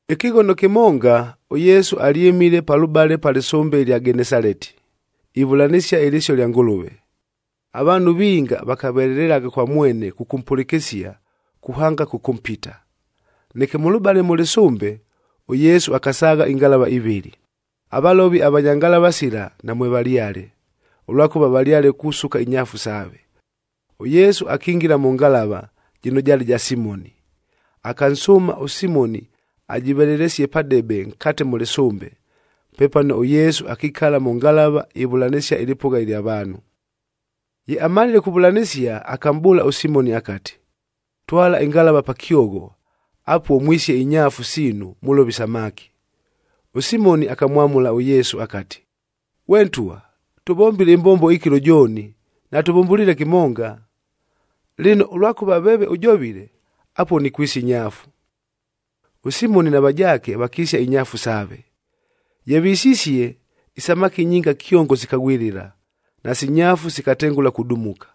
Ɨkɨghono kɨmonga, ʉYesu alyɨmile palʉbale pa lɨsʉmbe ɨlya Genesaleti,a ivʉlanɨsia ɨlɨsio ɨlya Ngʉlʉve. Avaanhu vinga vakavelelelagha kwa mwene kʉkʉmpʉlɨkɨsia, kuhanga kʉkʉmpita. Neke mʉlʉbale mʉ lɨsʉmbe, ʉYesu akasaagha ingalavab ivɨlɨ, avalovi avanya ngalava sila namwevalyale, ʉlwakʉva valyale kusuka inyaafu saave. ɄYesu akingila mʉ ngalava, jɨno jaale ja Simoni. Akansʉʉma ʉSimoni ajɨvelelesie padebe nkate mʉ lɨsʉmbe, pepano ʉYesu akikala mʉ ngalava ivʉlanɨsia ɨlɨpʉgha ɨlya vaanhu. Ye amalile kuvʉlanɨsia, akamʼbʉʉla ʉSimoni akati, “Twala ɨngalava pa kyogho, apuo mwisie inyaafu siinu, mʉlove isamaki.” ɄSimoni akamwamʉla ʉYesu akati, “Ghwe Ntwa, tʉvombile ɨmbombo ɨkɨlo jooni, natʉvʉmbʉliile kɨmonga. Lɨno, ʉlwakʉva veeve ʉjovile, apuo nikwisia inyaafu.” ɄSimoni na vajaake vakisia inyaafu saave. Ye visisie, isamaki nyinga kyongo sikaghwɨlɨla, nasi nyaafu sikatengʉla kudumuka.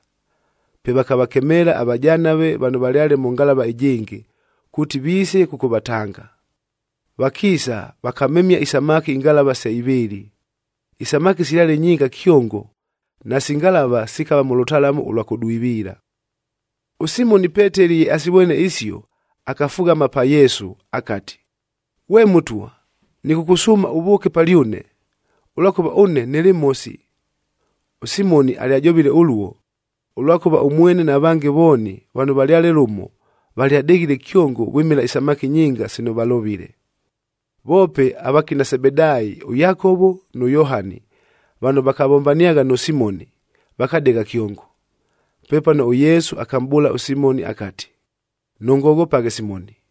Pe vakavakemeela avajanave vano valyale mʉ ngalava ɨjɨngɨ, kuuti viise kʉkʉvatanga. Vakiisa, vakamemia isamaki ingalava se ivɨɨlɨ, isamaki silyale nyinga kyongo nasi ngalava sikava mʉ lʉtalamu ʉlwa kʉdwiviila. ɄSimoni ʉPeteli ye asivwene isio, akafughama pa Yesu akati, “Ghwe Mʉtwa, nɨkʉkʉsʉʉma ʉvʉʉke palyʉne, ʉlwakʉva ʉne nɨlɨ mhosi.” ɄSimoni alyajovile ʉluo, ʉlwakʉva ʉmwene na vange vooni vano valyale lʉmo, valyadeghile kyongo vwɨmɨla isamaki nyinga sino valovile. Voope avakina Sebedaayi ʉYakovo nʉ Yohani, vano vakavombaniagha nʉ Simoni, vakadegha kyongo. Pepano ʉYesu akamʼbʉʉla ʉSimoni akati, “Nʉngoghopaghe Simoni,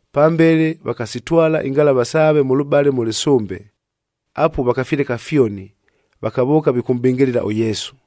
Pambele vakasitwala ingalava saave mʉlʉbale mʉ lɨsʉmbe, apuo vakafileka fyoni vakavʉʉka vikʉmʼbɨngɨlɨla ʉYesu.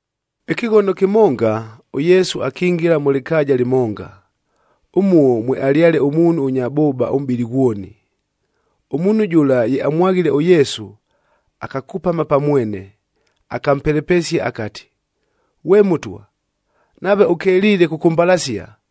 Ɨkɨghono kɨmonga, ʉYesu akingila mʉ lɨkaaja lɨmonga, ʉmuo mwealyale ʉmuunhu ʉnya bʉʉba ʉmʼbɨlɨ ghwoni. Ʉmuunhu jʉla ye amwaghile ʉYesu, akakupama pa mwene, akampelepesia akati, “Ghwe Mʉtwa, nave ʉkeliile kʉkʉmbalasia,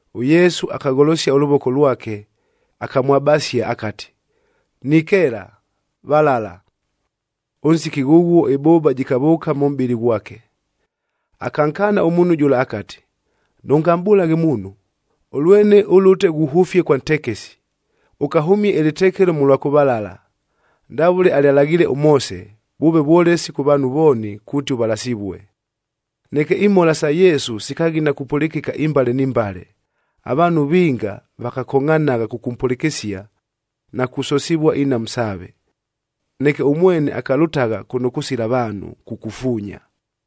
ɄYesu akagholosia ʉlʉvoko lwake, akamwabasia akati, “Nikeela, valala.” Ʉnsiki ghʉghuo ɨbʉʉba jɨkavʉʉka mʉ mʼbɨlɨ ghwake. Akankaana ʉmuunhu jʉla akati, “Nʉngamʼbʉlaghe muunhu, ʉlwene ʉlʉte ghuhʉfie kwa ntekesi, ʉkahʉmie ɨlɨtekelo mʉlwa kʉvalala, ndavʉle alyalaghiile ʉMoose,e vʉʉve vwolesi kʉ vaanhu vooni kuuti ʉvalasivue.” Neke imhola isa Yesu sikaghina kupʉlɨkɨka imbale ni mbale. Avaanhu vinga vakakongʼhanagha kʉkʉmpʉlɨkɨsia, na kusosivua inhamu saave. Neke ʉmwene akalʉtagha kʉno kʉsila vaanhu, kukufuunya.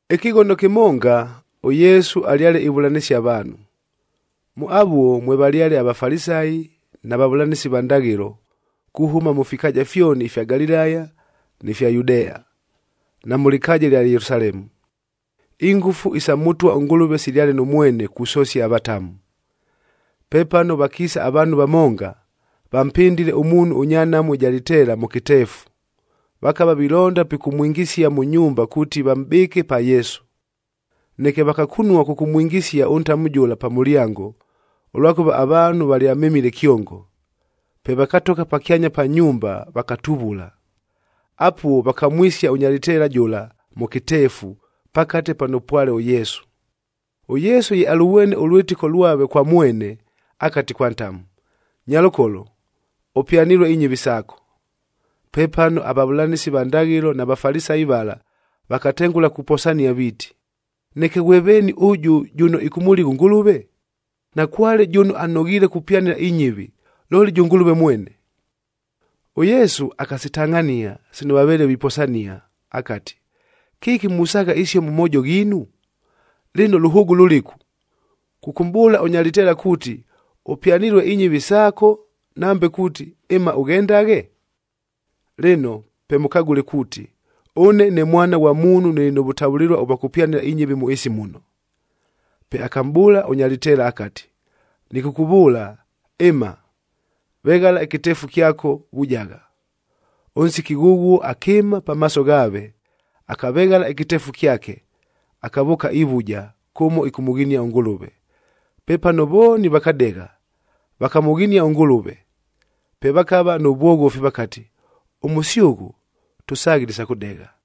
Ɨkɨghono kɨmonga, ʉYesu alyale ivʉlanɨsia avaanhu. Mʉ avuo mwevalyale aVafalisayi na vavʉlanɨsi va ndaghɨlo,f kuhʉma mʉ fikaaja fyoni ifya Galilaya ni fya Yudea, na mʉ lɨkaaja ɨlya Yelusalemu. Ingʉfu isa Mʉtwa ʉNgʉlʉve silyale nʉ mwene kusosia avatamu. Pepano vakiisa avaanhu vamonga, vampɨndile ʉmuunhu ʉnya nhamu ɨja lɨteela mʉ kɨteefu, vakava vilonda pikʉmwingisia mʉ nyumba kuuti vamʼbɨɨke pa Yesu. Neke vakakunua kʉkʉmwingisia ʉntamu jʉla pa mʉlyango, ʉlwakʉva avaanhu valyamemile kyongo. Pe vakatogha pakyanya pa nyumba, vakatuvula. Apuo vakamwisia ʉnya lɨteela jʉla mʉ kɨteefu, pakate pano pwale ʉYesu. ɄYesu ye alʉvwene ʉlwɨtɨko lwave kwa mwene, akati kwa ntamu, “Nyalʉkolo, ʉpyanilue inyɨvi saako.” Pepano avavʉlanɨsi va ndaghɨlo na Vafalisayi vala vakatengʉla kuposania viiti, “Neke ghwe veeni ʉjʉ jʉno ɨkʉmʉligha ʉNgʉlʉve? Nakwale jʉno anoghiile kupyanɨla inyɨvi, looli jʉ Ngʉlʉve mwene.” ɄYesu akasitangʼhania sino vaveele viposania akati, “Kɨki musaagha isio mʉ moojo ghiinu? Lɨno, lʉhʉʉgʉ lʉlɨku, kʉkʉmʼbʉʉla ʉnya lɨteela kuuti, ‘Ʉpyanilue inyɨvi saako,’ nambe kuuti, ‘Ɨma, ʉghendaghe’? Lɨno pe mʉkagʉle kuuti, ʉne ne Mwana ghwa Muunhug nɨlɨ nʉ vʉtavʉlɨlua ʉvwa kʉpyanɨla inyɨvi mʉ ɨɨsi muno...” Pe akamʼbʉʉla ʉnya lɨteela akati, “Nɨkʉkʉvʉʉla, ɨma, veghala ɨkɨteefu kyako, vujagha.” Ʉnsiki ghʉghuo akɨɨma pamaaso ghaave, akaveghala ɨkɨteefu kyake, akavʉʉka ivuja kʉmo ɨkʉmʉghinia ʉNgʉlʉve. Pepano vooni vakadegha, vakamʉghinia ʉNgʉlʉve. Pe vakava nʉ vwoghofi vakati, “Ʉmʉsyʉghʉ tʉsaghile isa kʉdegha!”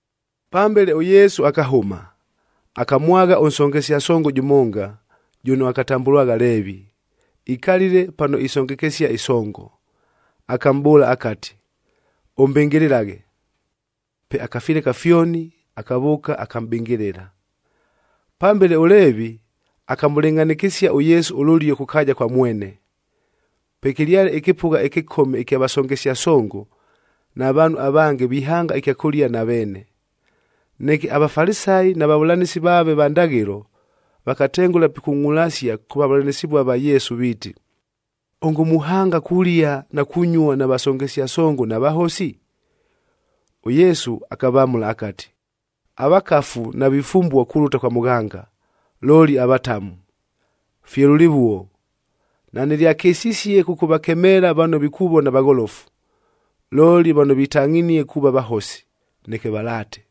Pambele ʉYesu akahʉma, akamwagha ʉnsongesia songo jʉmonga, jʉno akatambʉlwagha Leevi, ikalile pano isongekesia ɨsongo. Akamʼbʉʉla akati, “Ʉmbɨngɨlɨlaghe.” Pe akafileka fyoni, akavʉʉka, akamʼbɨngɨlɨla. Pambele ʉLeevi akamʉlɨngʼhanɨkɨsia ʉYesu ʉlʉlio kʉ kaaja kwa mwene. Pwekɨlyale ɨkɨpʉgha ɨkɨkome ɨkya vasongesia songo na vaanhu avange vihanga ɨkyakʉlia na veene. Neke aVafalisayi na vavʉlanɨsi vaave va ndaghɨlo, vakatengʉla pikungʼulasia kʉ vavʉlanɨsɨvuah va Yesu viiti, “Ongo muhanga kulia na kunyua na vasongesia songo na vahosi?” ɄYesu akavamʉla akati, “Avakafu navifumbua kulʉta kwa mʉghanga, looli avatamu. Fye lʉlɨvuo, nanɨlyakɨsisie kʉkʉvakemeela vano vikuvona vagholofu, looli vano vitangʼhinie kuuva vahosi, neke valaate.”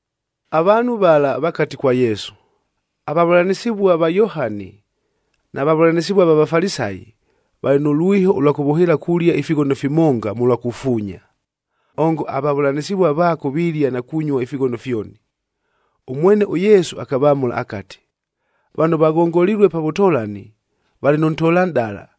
Avaanhu vala vakati kwa Yesu, “Avavʉlanɨsɨvua va Yohani na vavʉlanɨsɨvua va Vafalisayi, valɨ nʉ lwiho ʉlwa kʉvʉhɨɨla kulia ifighono fimonga mʉlwa kufuunya. Ongo avavʉlanɨsɨvua vaako vilia na kunyua ifighono fyoni!” Ʉmwene ʉYesu akavamʉla akati, “Vano vaghongolilue pa vʉtolani, valɨ nʉ ntolanʼdala,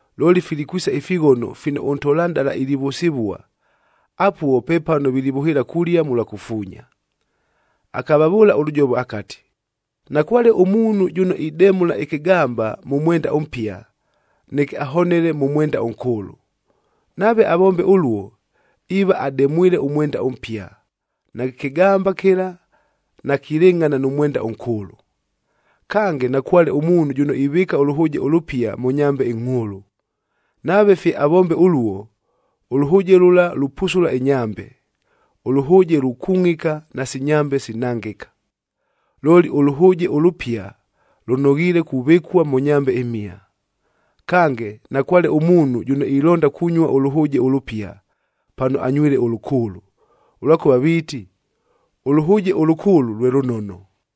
Looli, filikwisa ifighono fino ʉntolanʼdala ilivʉsɨvua, apuo pepano vilivʉhɨɨla kulia mʉlwa kufuunya.” Akavavʉʉla ʉlʉjovo akati, “Nakwale ʉmuunhu jʉno idemʉla ɨkɨgamba mʉ mwenda ʉmpia, neke ahonele mʉ mwenda ʉnkʉʉlʉ. Nave avombe ʉluo, iiva ademwile ʉmwenda ʉmpia, nakɨ kɨgamba kɨla nakilɨngʼhana nʉ mwenda ʉnkʉʉlʉ. Kange, nakwale ʉmuunhu jʉno ivɨɨka ʉlʉhʉʉje ʉlʉpia mʉ nyambej ingʼhʉʉlʉ, nave fye avombe ʉluo, ʉlʉhʉʉje lʉla lupusula inyambe, ʉlʉhʉʉje lukungʼika nasi nyambe sinangɨka. Looli, ʉlʉhʉʉje ʉlʉpia lʉnoghiile kuvɨkua mʉ nyambe imhia. Kange, nakwale ʉmuunhu jʉno ilonda kunyua ʉlʉhʉʉje ʉlʉpia, pano anywile ʉlʉkʉʉlʉ, ʉlwakʉva viiti, ‘Ʉlʉhʉʉje ʉlʉkʉʉlʉ lwe lʉnono.’”